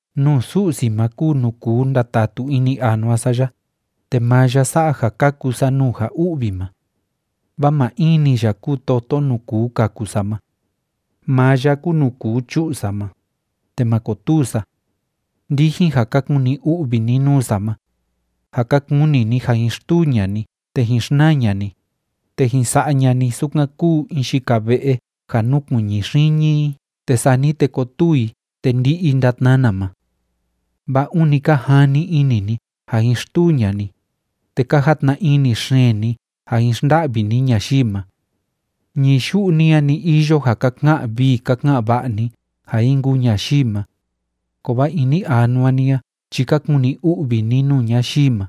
Nuu Su'si ma kúu nuu kuu ndatatu ini anua sa ya, te maa ya sa'a ja kaku sa nuu ja u'vi ma. Vaa maa in‑ni ya kúu toto nuu kuu kaku sa ma. Maa ya kúu nuu kuu chu'u sa ma, te ma kotuu sa. Ndijin ja ka kuni u'vi ni nuu sa ma, ja ka kuni ni ja jin xtuu ña'a ni te jin xnaa ña'a ni, te jin sa'a ña'a ni sukan kúu in yika ve'e ja núkuiñi xiñi i te sani te kotuu i te ndi'i i ndatnana ma. Vaa ûni ka jani ini ni ja jin xtuu ña'a ni, te ka jatna ini xeen ni ja jin xnda'vi ni ñayii ma. Ñií yu'u ni a‑ni iyo ja ka ka'an vii ka ka'an va'a ni ja jin kuu ñayii ma, kovaa ini anua ni a chi ka kuni u'vi ni nuu ñayii ma.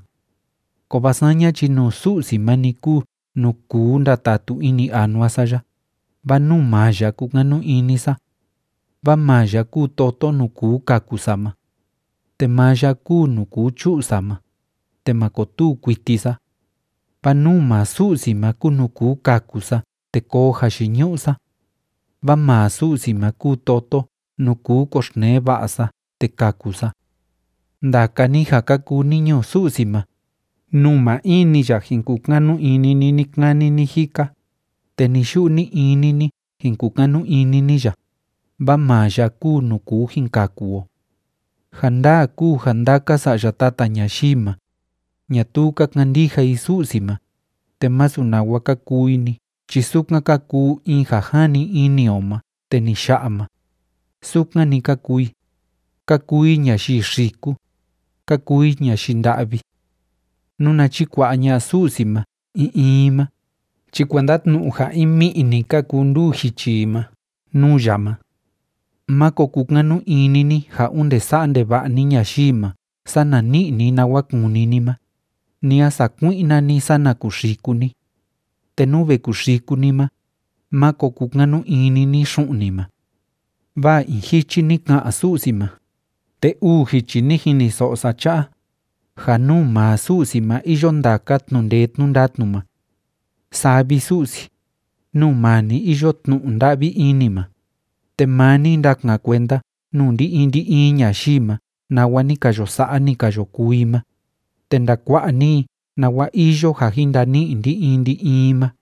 Kovaa saña chi nuu Su'si ma‑ni kúu nuu kuu ndatatu ini anua sa ya, vaa nuu maa ya kúkanu ini sa. Vaa maa ya kúu toto nuu kuu kaku sa ma. Te maa ya kúu nuu kuu chu'u sa ma, te ma kotuu kuiti sa. Vaa nuu maa Su'si ma kúu nuu kuu kaku sa te koo jayiñu'u sa. Vaa maa Su'si ma kúu toto nuu kuu koxtnee va'a sa te kaku sa. Ndaka ni ja ka kuu ni ñuu Su'si ma, nuu maa in‑ni ya jin kukanu ini ni ni‑kani ni‑jika, te ni‑yu'u ni‑ini ni jin kukanu ini ni ya, vaa maa ya kúu nuu kuu jin kaku o. Ja ndaa kúu ja ndaka sa'ya tata ñayii ma, ñatuu ka kandija i Su'si ma, te masu nawa ka kuu i‑ni chi sukan ka kuu in ja jani ini o ma te ni ya'a ma, sukan‑ni ka kuu i, ka kuu i ñayii xiku, ka kuu i ñayii nda'vi. Nuna chikua'a ña'a Su'si ma in in i ma chi kuenda tnu'u in mi'i‑ni ka kuu nduu jichi i ma nuu ya ma. Máko kukanu ini ni ja onde sa'a ndeva'a ni ñayii ma sana ni'i ni nawa kúni ni ma, ni a sakui'na ni sana kuxiku ni. Te nú ve kuxiku ni ma, máko kukanu ini ni xu'un ni ma. Vaa in jichi ni ka'an Su'si ma, te uu jichi ni jiniso'o sa cha'a, ja nuu maa Su'si ma iyo ndaka tnu'u ndee tnu'u ndatnu ma. Saa vi, Su'si, nuu maa ni iyo tnu'u nda'vi ini ma, te maa ni ndakan kuenda nuu ndi‑in ndi‑in ñayii ma nawa ni ka yo sa'a, ni ka yo kuu i ma, te ndakua'a ni i nawa iyo ja jin ndani'i ndi‑in ndi‑in i ma.